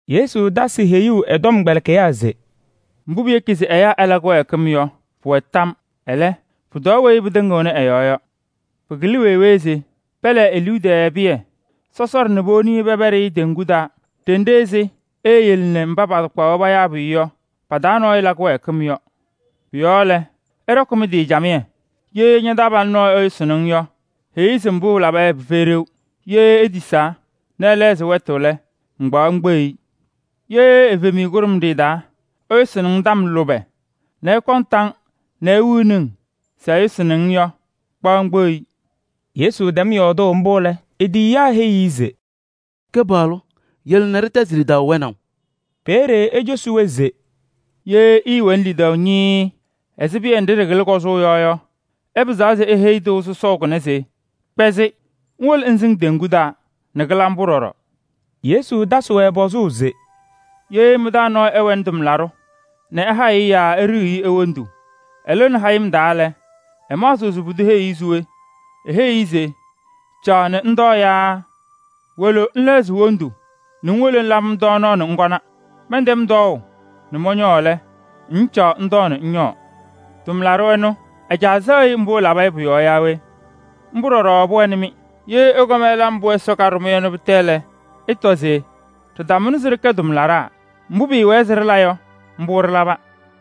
Yesu tasɩ heyuu ɛ-tɔmkpɛlɩkɩyaa se: “Mbʋ piyeki se ɛyaa ɛla kɩwɛɛkɩm yɔ, pʋwɛ tam. Ɛlɛ, pʋtɔɔ weyi pɩtɩŋɩɣnɩ ɛ-yɔɔ yɔ. Pɩkɩlɩ wee wee se pɛlɛɛ e-liu tɛɛ pɩyɛ sɔsɔɖɛ nɛ powoni pɛpɛɖɩ teŋgu taa ɖenɖe ɛzɩ eeyele nɛ mba patakpaɣ-wɛ payaa pʋyʋ yɔ pa-taa nɔɔyʋ la kɩwɛɛkɩm yɔ. Pʋ-yɔɔ lɛ, ɩɖɔkɩ mɩ-tɩ camɩyɛ! Ye ña-taabalʋ nɔɔyʋ ɛyʋsɩnɩ-ŋ yɔ, heyi-i se mbʋ ɛlaba yɔ pɩfɛyɩ ɖeu. Ye etisaa nɛ ɛlɛɣzɩ wɛtʋ lɛ, ŋkpaɣ ŋkpeɣ-i. Ye evemiye kʋɖʋmɖɩyɛ taa ɛyʋsɩnɩ-ŋ tɔm lʋbɛ nɛ ɛkɔŋ tam nɛ ewiɣni-ŋ se ɛyʋsɩnɩ-ŋ yɔ, kpaɣ ŋkpeɣ-i.” Yesu tɛm yɔɔdʋʋ mbʋ lɛ, e-tiyiyaa heyi-i se: “Kɩpaɣlʋ! Yele nɛ ɖɩtɛzɩ lidaʋ wɛnaʋ.” Peeye ecosi-wɛ se: “Ye ɩɩwɛnɩ lidaʋ ñɩɩɩ ɛzɩ piye nɖɩ ɖɩkɩlɩ kɔzʋʋ yɔ yɔ, ɩpɩzaɣ se iheyi tɩʋ sɔsɔʋ kʋnɛ se: ‘Kpɛzɩ ŋwolo ŋsɩŋ teŋgu taa!’ Nɛ kɩla mbʋ ɖɔɖɔ.” Yesu tasɩ-wɛ pɔzʋʋ se: “Ye mɩ-taa nɔɔyʋ ɛwɛnɩ tʋmlaɖʋ nɛ ɛhayɩɣ-ɩ yaa eɖiyiɣ-i wondu, ɛlɩɣnɩ hayɩm ɛtalɩ lɛ, ɩmaɣzɩɣ se pʋdʋ heyiɣ-i se we? Eheyiɣ-i se: ‘Caɣ nɛ ŋtɔɔ’ yaa ‘Wolo ŋlɛɣzɩ wondu nɛ ŋwolo ŋlabɩ-m tɔɔnaɣ nɛ ŋkɔna. Mɛntɛm tɔɔʋ nɛ mɔñɔɔ lɛ, ŋŋcaɣ ŋtɔɔ nɛ ŋñɔɔ?’ Tʋmlaɖʋ ɛnʋ, ɛ-caa sɛɣ-ɩ mbʋ ɛlaba yɔ pʋ-yɔɔ yaa we? Mbʋ ɖɔɖɔ pʋwɛnɩ-mɩ. Ye ɩkɔm ɩla mbʋ Ɛsɔ kaɖʋ-mɩ yɔ lɛ, ɩtɔ se: ‘Ɖɩtamʋnɩ se ɖɩkɛ tʋmlaɖaa. Mbʋ pɩɩwɛɛ se ɖɩla yɔ, mbʋ ɖɩlaba.’”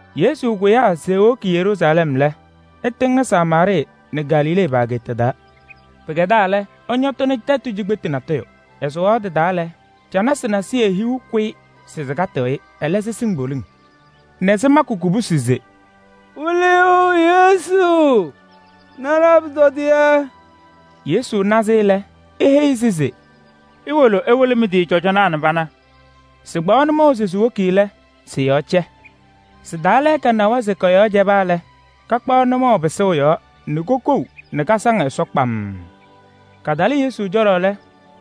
Yesu kʋyaa se ewoki Yeruusalɛm lɛ, ɛtɩŋnɩ Samaarɩɩ nɛ Galilee pa-ageeta taa. Pɩkɛdaa lɛ, ɛñɔtɩnɩ tɛtʋ cikpetu natʋyʋ. Ɛsʋwaɣ tɩ-taa lɛ, canasɩ nasɩyɩ hiu kʋyɩ se sɩkatɩɣ-ɩ. Ɛlɛ sɩsɩŋ poliŋ nɛ sɩmakɩ kubusi se: “Wɩlɩyʋ! Yesu! Na ɖa-pʋtɔdɩyɛ.” Yesu na-sɩ lɛ, eheyi-sɩ se: “Iwolo ɩwɩlɩ mɩ-tɩ cɔjɔnaa nɛ pana.” Sɩkpaɣ nʋmɔʋ se siwoki lɛ, sɩ-yɔɔ cɛ. Sɩ-taa lɛɛka nawa se kɔ-yɔɔ cɛba lɛ, kakpaɣ nʋmɔʋ pɩsʋʋ yɔɔ nɛ kasaŋ Ɛsɔ kpamm. Katalɩ Yesu cɔlɔ lɛ,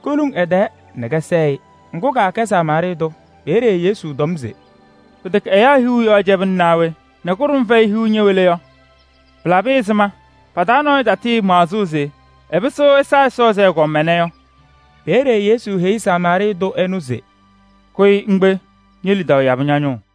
koluŋ ɛ-tɛɛ nɛ kɛsɛɛ-ɩ. Ŋgʋ, kaakɛ Samaarɩɩ tʋ. Peeye Yesu tɔm se: “Pɩtɛkɛ ɛyaa hiu yɔɔ cɛbɩna naa we? Nɛ kʋɖʋm fɛyɩ hiu ñɛwɛ le yɔ? Pɩlabɩ ɛzɩma pa-taa nɔɔyʋ tatɩɩmaɣzɩ se ɛpɩsɩɣ ɛsa Ɛsɔ ɛzɩ ɛgɔm ɛnɛ yɔ?” Peeye Yesu heyi Samaarɩɩ tʋ ɛnʋ se: “Kʋyɩ ŋkpe, ñe-lidaʋ yabɩ ña-nʋʋ.”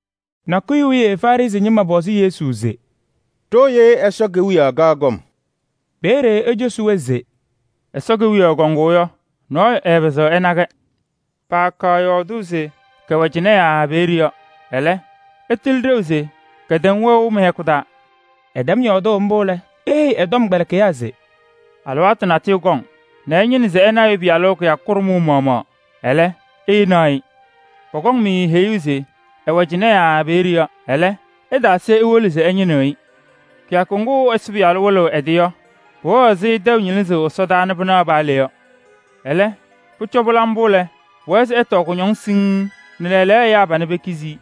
Nakʋyʋ wiye Farɩsɩ ñɩma pɔzɩ Yesu se: “Ɖooye Ɛsɔ Kewiyaɣ kaɣ kɔm” Peeye ecosi-wɛ se: “Ɛsɔ Kewiyaɣ kɔŋʋʋ yɔ, nɔɔyʋ ɛɛpɩzɩɣ ɛna-kɛ. Paakaɣ yɔɔdʋʋ se kɛwɛ cɩnɛ yaa peeye yɔ. Ɛlɛ, ɩtɩlɩ ɖeu se kɛtɛm wɛʋ mɩ-hɛkʋ taa.” Ɛtɛm yɔɔdʋʋ mbʋ lɛ, eheyi ɛ-tɔmkpɛlɩkɩyaa se: “Alɩwaatʋ natʋyʋ kɔŋ nɛ ɩñɩnɩ se ɩna Ɛyʋ Pɩyalʋ kɩyakʋ kʋɖʋmʋʋ maɣmaɣ, ɛlɛ, ɩɩnaɣ-ɩ. Pɔkɔŋ-mɩ heyuu se ɛwɛ cɩnɛ yaa peeye yɔ. Ɛlɛ, ɩtaase iwolo se ɩñɩnɩɣ-ɩ. Kɩyakʋ ŋgʋ Ɛyʋ Pɩyalʋ lɩzɩɣ ɛ-tɩ nɛ ɛwɩlɩ yɔ, pʋwɛɣ ɛzɩ tɛʋ ñɩlɩsʋʋ ɛsɔdaa nɛ pɩnaɣ paa le yɔ. Ɛlɛ, pʋcɔ pɩla mbʋ lɛ, pʋwɛɛ se ɛtɔɔ kʋñɔŋ siŋŋ nɛ lɛɛlɛɛyɔ ɛyaa panɛ pekizi-i.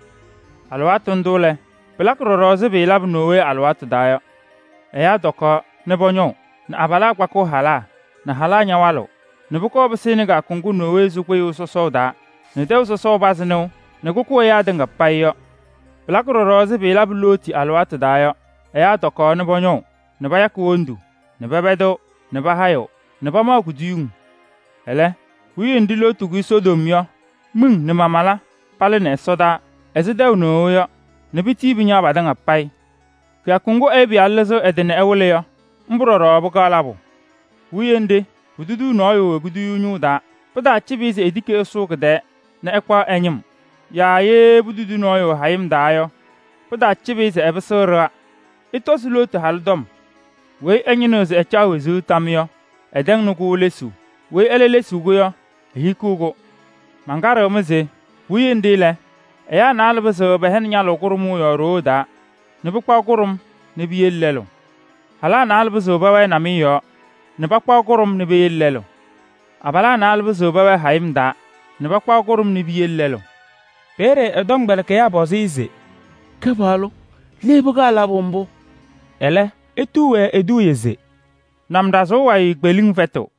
Alɩwaatʋ ndʋ lɛ, pɩlakɩ ɖɔɖɔ ɛzɩ pɩɩlabʋ Nowee alɩwaatʋ taa yɔ: ɛyaa tɔkaɣ nɛ pɔñɔʋ nɛ abalaa kpakɩɣ halaa nɛ halaa ñawalɩɣ nɛ pʋkɔɔ pɩsɩnɩ kɩyakʋ ŋgʋ Nowee sʋ kpɩyʋʋ sɔsɔʋ taa nɛ tɛʋ sɔsɔʋ pazɩ nɩʋ nɛ kʋkʋ ɛyaa tɩŋa payɩ yɔ. Pɩlakɩ ɖɔɖɔ ɛzɩ pɩɩlabʋ Looti alɩwaatʋ taa yɔ: ɛyaa tɔkaɣ nɛ pɔñɔʋ nɛ payakɩ wondu nɛ pɛpɛdɩɣ nɛ pahayɩɣ nɛ pamaɣ kuduyiŋ. Ɛlɛ, puwiye nɖɩ Looti kʋyɩ Sodom yɔ, miŋ nɛ mamala palɩnɩ ɛsɔdaa ɛzɩ tɛʋ nɩɣʋ yɔ nɛ pitii pɩñaɣ patɩŋa payɩ. Kɩyakʋ ŋgʋ Ɛyʋ Pɩyalʋ lɩzɩɣ ɛ-tɩ nɛ ɛwɩlɩ yɔ, mbʋ ɖɔɖɔ pɩkaɣ labʋ. Puwiye nɖɩ, putudi nɔɔyʋ e-kuduyuu ñʋʋ taa yɔ, pɩtaacɩbɩ-ɩ se etiki ɛsʋʋ kɩ-tɛɛ nɛ ɛkpaɣ ɛ-ñɩm. Yaa ye putudi nɔɔyʋ hayɩm taa yɔ, pɩtaacɩbɩ-ɩ se ɛpɩsɩɣ ɖɩɣa. Ɩtɔzɩ Looti halʋ tɔm. Weyi ɛñɩnɩɣ se ɛcaɣ wezuu tam yɔ, ɛtɛŋnɩ-kʋ lesuu. Weyi ɛlɛ lesiɣ-kʋ yɔ, ehikiɣ-kʋ. Mankaɖɩɣ-mɩ se: puwiye nɖɩ lɛ, ɛyaa naalɛ pɩzɩɣ pɛhɛnɩ ñalʋʋ kʋɖʋmʋʋ yɔɔ ɖoo taa nɛ pakpaɣ kʋɖʋm nɛ piyele lɛlʋ. Halaa naalɛ pɩzɩɣ pɛwɛɛ namɩyɛ yɔɔ nɛ pakpaɣ kʋɖʋm nɛ piyele lɛlʋ. [ Abalaa naalɛ pɩzɩɣ pɛwɛɛ hayɩm taa nɛ pakpaɣ kʋɖʋm nɛ piyele lɛlʋ.”] Peeye ɛ-tɔmkpɛlɩkɩyaa pɔzɩ-ɩ se: “Kɩpaɣlʋ! Le pɩkaɣ labʋ mbʋ?” Ɛlɛ etuu-wɛ eduuye se: “Namɖazʋʋ wayɩ kpeliŋ fɛtɩɣ.”